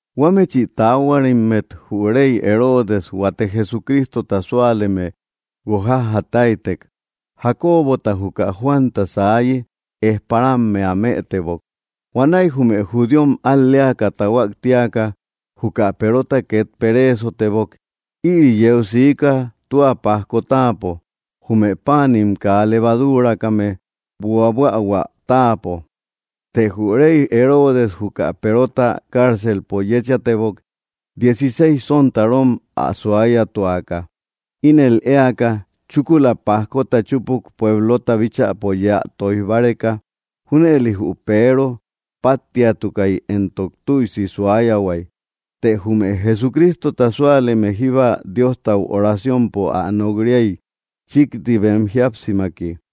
Huámechi taáhuarimmet jü rey Herodes huate Jesucrístota súaleme guokjájataitek. Jacobota juka Juanta saayi ejparammea mëtebok. Huanäi jume judíom al‑léaka tahuák tíaka, juka Perota ket peréesotebok. Ïri yeu siika tua pajko táapo, jume páanim kaa levadúrakame buabuähuä táapo. Të jü rey Herodes juka Perota cárcelpo yéchatebok dieciséis sontarom ä suáyatuaka, ínel éaka, chúkula pajkota chúpuk puéblota bíchäpo yéä tóij báreka. Júnëli jü Peero páttiatukai éntok tüisi suáyahuai, teé jume Jesucrístota súaleme jíba Diostau oraciompo ä nok‑riay chikti bem jíapsimaki.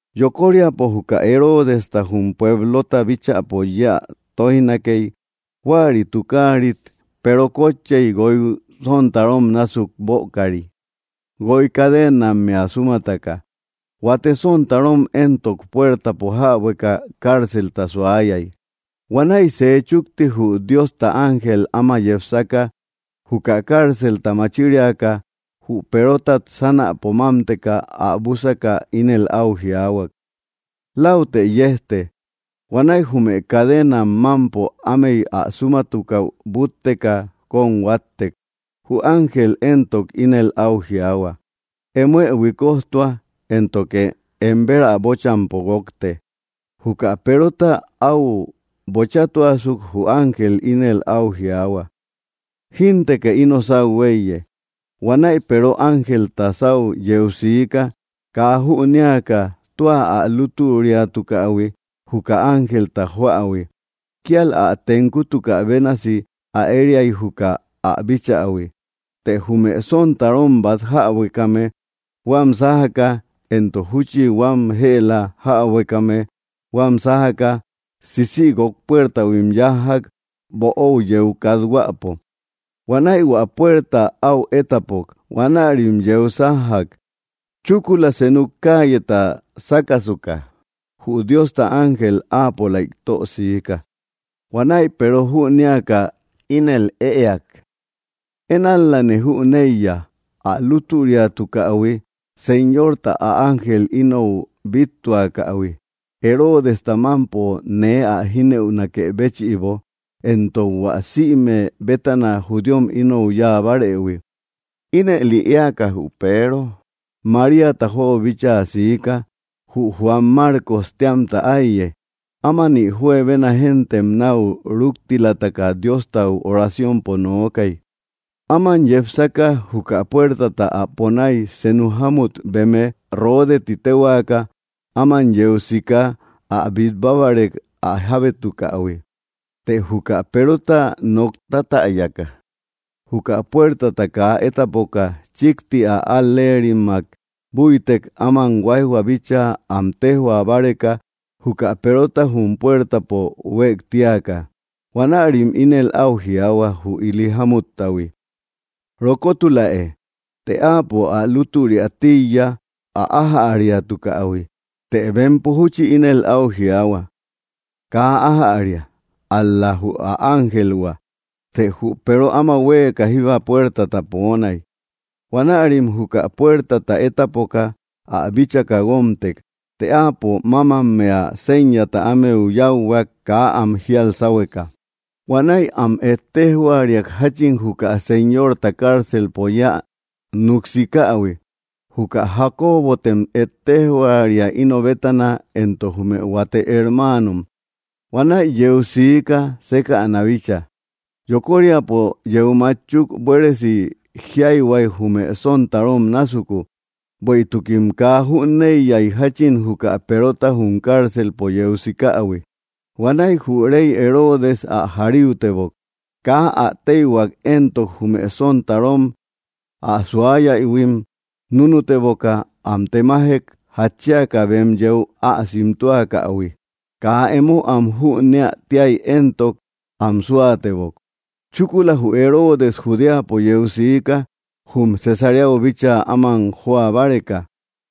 Yokoríapo juka Heródesta jum puéblota bíchäpo yéä tóijnakei, huäri tukáarit Peero kotchei guoi sontarom násuk bökari, guoi cadenammea súmataka. Huate sontarom éntok, puértapo jäbueka cárcelta suayai. Huanäi sej chukti jü Diosta ángel áma yepsaka, juka cárcelta machíriaka, jü Perotat sánäpo mámteka ä bússaka, ínel au jiaahuak: —Lautë yejte. Huanäi jume cadenam mampo ámey ä súmatukau bútteka kom huáttek, Jü ángel éntok ínel au jiaahua: —Emoë huikojtua, éntoke em berä bochampo guókte. Juka Perota au bochátuasuk jü ángel ínel au jiaahua: —Jínteke ino sáu huéiye. Huanäi Peero ángelta sáu yeu siika, kaa jünéaka tua ä lútüriatukähui juka ángelta joähui. Kíal ä tenkutukä bénasi ä ériai juka ä bíchähui. Te jume sontarom bat jäbuekame huam sájaka, éntok júchi huam jëla jäbuekame huam sájaka, sísïguok puertauhuim yájjak böóu yeu kathuäpo. Huanäi hua puerta au étapok. Huanärim yeu sájjak. Chúkula senu cálleta sákasuka jü Diosta ángel áapolaik tösiika. Huanäi Peero jünéaka ínel ëeak: —Én ál‑lane jüneiya ä lútüriatukähui Señorta ä ángel inou bíttuakähui Heródesta mampo nee ä jínëunakë béchïbo, éntok hua sïme bétana judíom inou yáa bárëhui. Ínëli éaka jü Peero Maríata joau bíchaa siika, jü Juan Márcos téamta áiye, ámani juebena géntem nau rúktilataka Diostau oraciompo nookay. Áman yepsaka, juka puértata ä ponái, senu jámmut beme, Ródeé ti téhuaka, áman yeu siika ä bit báreka ä jábétukähui. Të juka Perota nok tátäyaka, juka puértata kaa étapoka, chikti ä al‑léerimmak búitek áman huaijhua bíchaa am téjhua báreka juka Perota jum puértapo huéktíaka. Huanärim ínel au jiaahua jü ili jámuttahui: —¡Rokótuläe! Të áapo ä lútüria tíiya ä ájäriatukähui. Të bempo júchi ínel au jiaahua: —Kaa ájäria, ál‑la jü ä ángelhua. Të jü Peero áma huéeka jíba puértata poonai. Huanärim juka puértata étapoka ä bíchaka guómtek. Të áapo mámammea séñata ámeu yáuhuak kaa am jíal sáhueka. Huanäi am ettejhuariak jachin juka Señorta cárcelpo yéä nuksikähui: —Juka Jacobotem ettéjhuaria íno bétana éntok jume huate hermáanom. Huanäi yeu siika sékäna bícha. Yokóriapo yeu mátchuk, buéresi jiáihuai jume sontarom násuku, bueïtukim kaa jüneiyai jachin juka Perota jum cárcelpo yeu sikähui. Huanäi jü rey Herodes ä jaríutebok. Kaa ä téihuak éntok, jume sontarom ä suáyaïhuim núnuteboka am temájek jatchíaka bem yéu ä simtúakähui. Kaa emo am jüneä tiai éntok, am súatebok. Chúkula jü Herodes Judéapo yeu siká, jum Cesaréau bíchaa áman joa báreka.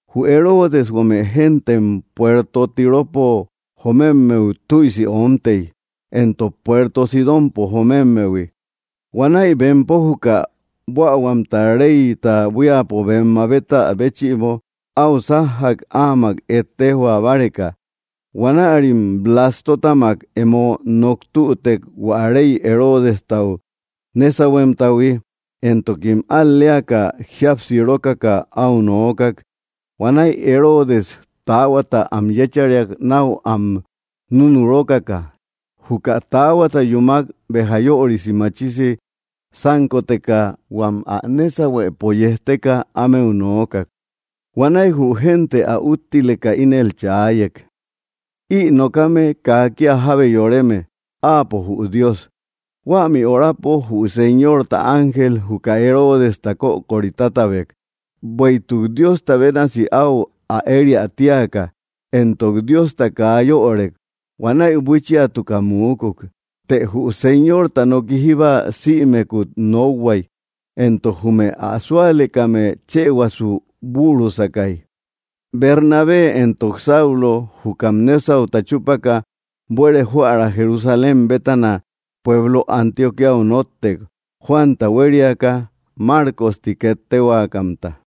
Jü Herodes huame géntem puerto Tiropo jomemmeu tüisi oómtei, éntok puerto Sidonpo jomémmehui. Huanäi bempo juka buähuamta reyta buíapo bem mabétä béchïbo au sájjak áamak ettejhua báreka. Huanärim Blástotamak emo nok tütek, hua rey Heródestau nésauhuemtahui, éntokim al‑léaka jíapsirókaka au noókak. Huanäi Herodes taáhuata am yéchariak nau am nunurókaka. Juka taáhuata yúmak, béja yörisi machisi sánkoteka huam ä nésauhuëpo yejteka ámeu noókak. Huanäi jü génte ä úttileka ínel chaáyek: —¡Ï nokame kaa kia jábe yoreme, áapo jü dios! Huämi orapo jü Señorta ángel juka Heródesta kökori tátabek, bueïtuk Diosta bénasi au ä ériai tíaka, éntok Diosta kaa yörek. Huanäi buíchiatuka muúkuk. Të jü Señorta noki jíba sïmekut nokhuai, éntok jume ä súalekame chëhuasu bürusakai. Bernabé éntok Saulo, jukam nésauta chúpaka, buere joära Jerusalém bétana pueblo Antioquíau nóttek, Juanta huériaka Márcos ti ket tehuakamta.